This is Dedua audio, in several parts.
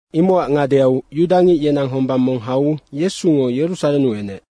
Imocac ngadeau yudangic yenang hombang mong hau Yesungo Yerusarennu enec.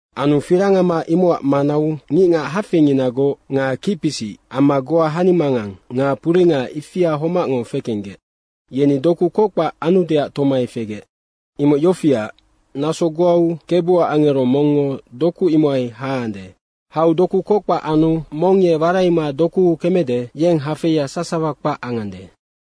Anu firangama imocac manau ngicngac hafeinginagoc nga kicpisic amma goa hanimangang nga puringa ifia homacngo fekenggec, yeni doku kockpac anudeac tomai fegec. Imoc yofiac, naso goau Kebuac angero mongngo doku imohai haande. Hau doku kockpac anu mong ye waraima dokuu kemede, yeng hafeia sasawa kpac angande.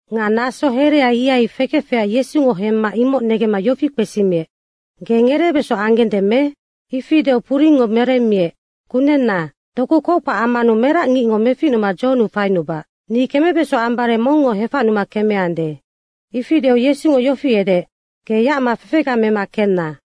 Nga naso herea ihai fekefecac Yesungo hemma imoc negemma yofi kpesimiec, “Ge ngereebeso anggende me?” Ifi deu puringngo meremmiec, “Kunenna, doku kockpac ammanu merac ngicngo meficnuma dzohonnu fainubac. Ni kemebeso ambare mongngo hefacnuma kemeande.” Ifi deu Yesungo yofi edeec, “Ge yacma fefega mema kenna.”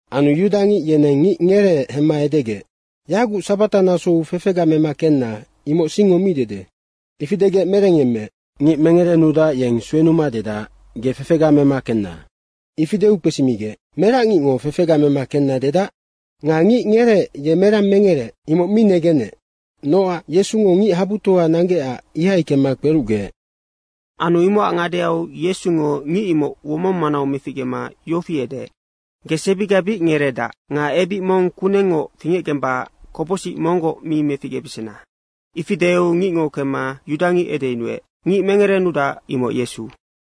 Anu yudangic yeneng ngic ngereec hemma edegec, “Yaguc sabatanasou fefega mema kenna, imoc singngo mi dede.” Ifi degec merengyemmeec, “Ngic mengerenudac, yeng suenuma dedac, ‘Ge fefega mema kenna.’” Ifi deu kpesimigec, “Merac ngicngo fefega mema kenna.” dedac? Nga ngic ngereec ye merang mengereec, imoc mi negenec nocac Yesungo ngichabutoa nanggecac, ihai kemma kperucgeec. Anu imocac ngadeau Yesungo ngic imoc womong manau meficgema yofi edeec, “Ge sebiga bic ngereedac. Nga ebic mong kunengngoc fingecgembacac kopocsic monggoc mi meficgebesena.” Ifi deu ngicngo kemma yudangic edeyunuec, “Ngic mengerenudac, imoc Yesu.”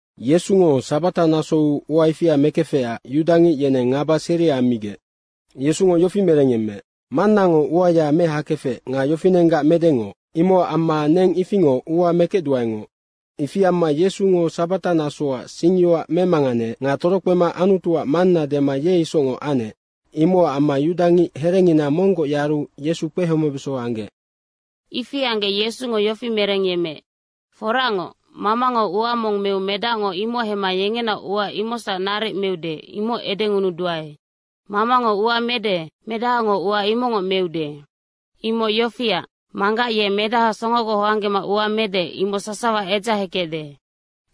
Yesungo sabata nasou ua ifia mekefecac yudangic yeneng ngaba seria ammigec. Yesungo yofi merengyemmeec, “Mannango uaya mehakefec nga yofinenggac medengoc imocac amma neng ifingoc ua mekecduaengoc.” Ifi amma Yesungo sabatanasoac singyoac memanganeec nga torokpema Anutuac Manna dema ye isocngoc anec, imocac amma yudangic herengina monggoc yaru Yesu kpehomebeso anggec. Ifi anggec Yesungo yofi merengyemmeec, “Foracngoc, Mamango ua mong meu Medacngo imoc hemma yengenaoc ua imocsac naric meude, imoc edengunuduae. Mamango ua mede, Medahango ua imocngoc meude. Imoc yofiac, Manggac ye Medaha songogoc hoanggema ua mede, imoc sasawa edzahekecde.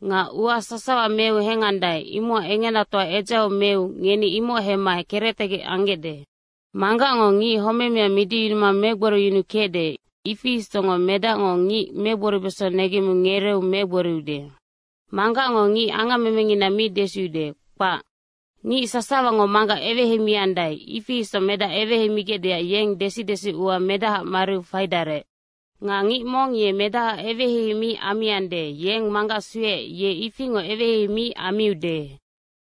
Nga ua sasawa meu hengandae, imocac engenatoa edzaheu meu ngeni imoc hemma kerectegec anggecde. Manggacngo ngic homemea midiyunuma megboriyunukecde, ifi isocngoc Medacngo ngic megboribeso negemmiu ngereeu megboriude. Manggacngo ngic angammemengina mi desiude, kpac. Ngic sasawango Manggac eweheimiandae, ifi isoc Medac eweheimigecdeac yeng desi desiua Medahaac mariu faidarec. Nga ngic mong ye Medahaac eweheihei mi ammiande, yeng Manggac sueec, ye ifingoc eweheihei mi ammiude.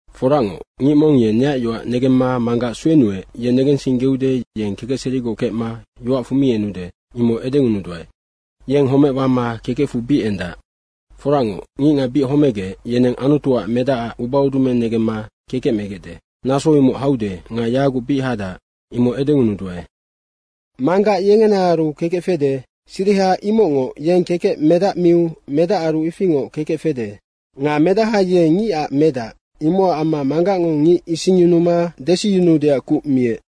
Foracngoc, ngic mong ye neac yoac negemma Manggac suenuec, ye negensinggeude, yeng kekecserigoc kecma yoacfu mi enude, imoc edengunuduae. Yeng homec wama kekecfu bic endac. Foracngoc, ngicngac bic homegec, yeneng Anutuac Medacac ubaudumeng negemma kekec megecde. Naso imoc haude nga yaguc bic hadac, imoc edengunuduae. Manggac yengenaaru kekec fede, siriha imocngoc yeng kekec Medac miu Medacaru ifingoc kekec fede. Nga Medaha ye Ngicac Medac, imocac amma Manggacngo ngic isingyunuma desiyunuudeac kuc miec.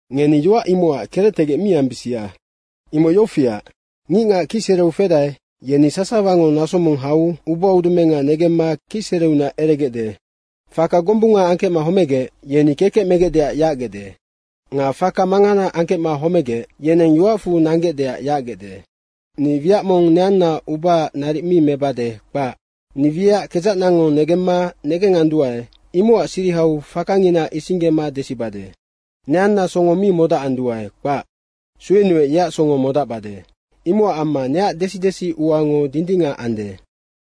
Ngeni yoac imocac kerectegec mi ambisia. Imoc yofiac, ngicngac kicsereu fedae, yeni sasawango naso mong hau ubaudumenga negemma kicsereunac eregecde. Faka gombunga angkecma homegec, yeni kekec megecdeac yacgecde. Nga faka mangana angkecma homegec, yeneng yoacfu nanggecdeac yacgecde. Ni wiac mong neanna ubaac naric mi mebade, kpac. Ni wiac kedzacnango negemma negenganduae, imocac sirihau fakangina isinggema desibade. Neanna songo mi modacanduae, kpac. Suenuec yeac songo modacbade. Imocac amma neac desi desiuango dindingac ande.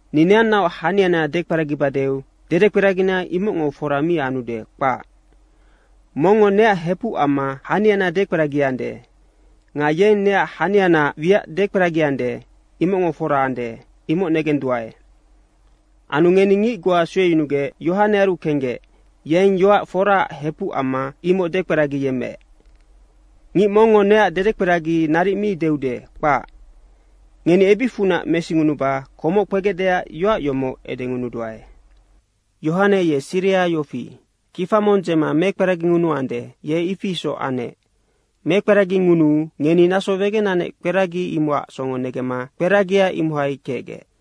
Ni neannaoc haniana dekperagibadeu dedekperagina imocngo fora mi anude, kpac. Mongngo neac hepuc amma haniana dekperagiande. Nga yeng neac hanianaac wiac dekperagiande, imocngo fora ande, imoc negenduae. Anu ngeni ngic goa sueyunugec Yohanearu kenggec, yeng yoac foraac hepuc amma imoc dekperagiyemmeec. Ngic mongngo neac dedekperagi naric mi deude, kpac. Ngeni ebicfunac mesingunuba komoc kpegecdeac yoac yomoc edengunuduae. Yohane ye siriha yofi, kifa mong dzema mekperagingunuande, ye ifi isoc anec. Mekperagingunuu ngeni naso wegenanec kperagi imocac songo negemma kperagia imohai kecgec.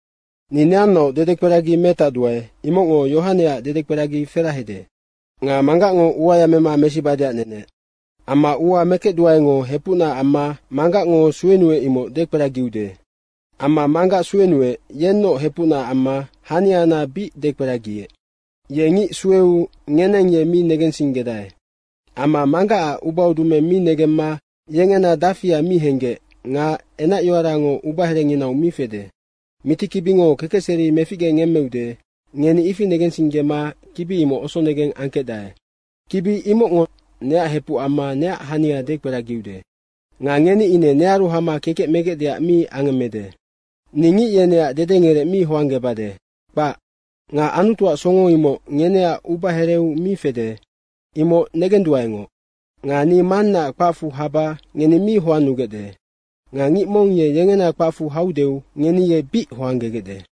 Ni neannaoc dedekperagi metacduae, imocngo Yohaneac dedekperagi ferahede. Nga Manggacngo uaya mema mesibadeac nenec. Amma ua mekecduaengo hepucna amma Manggacngo suenuec imoc dekperagiude. Amma Manggac suenuec, yennoc hepucna amma haniana bic dekperagiec. Ye ngic sueu ngeneng ye mi negensinggedae amma Manggacac ubaudumeng mi negemma yengena dafia mi henggec nga enacyoarango ubaherenginau mi fede. Mitikibingo kekecseri meficgengemmeude, ngeni ifi negensinggema kibi imoc osonegeng angkecdae. Kibi imocngonoc neac hepuc amma neac hania dekperagiude. Nga ngeni ine nearu hama kekec megecdeac mi angemmede. Ni ngic yeneac dedengerec mi hoanggebade, kpac. Nga Anutuac songo imoc ngeneac ubahereu mi fede, imoc negenduaengoc. Nga ni Mannaac kpacfu haba ngeni mi hoannugecde. Nga ngic mong yengena kpacfu haudeu ngeni ye bic hoanggegecde.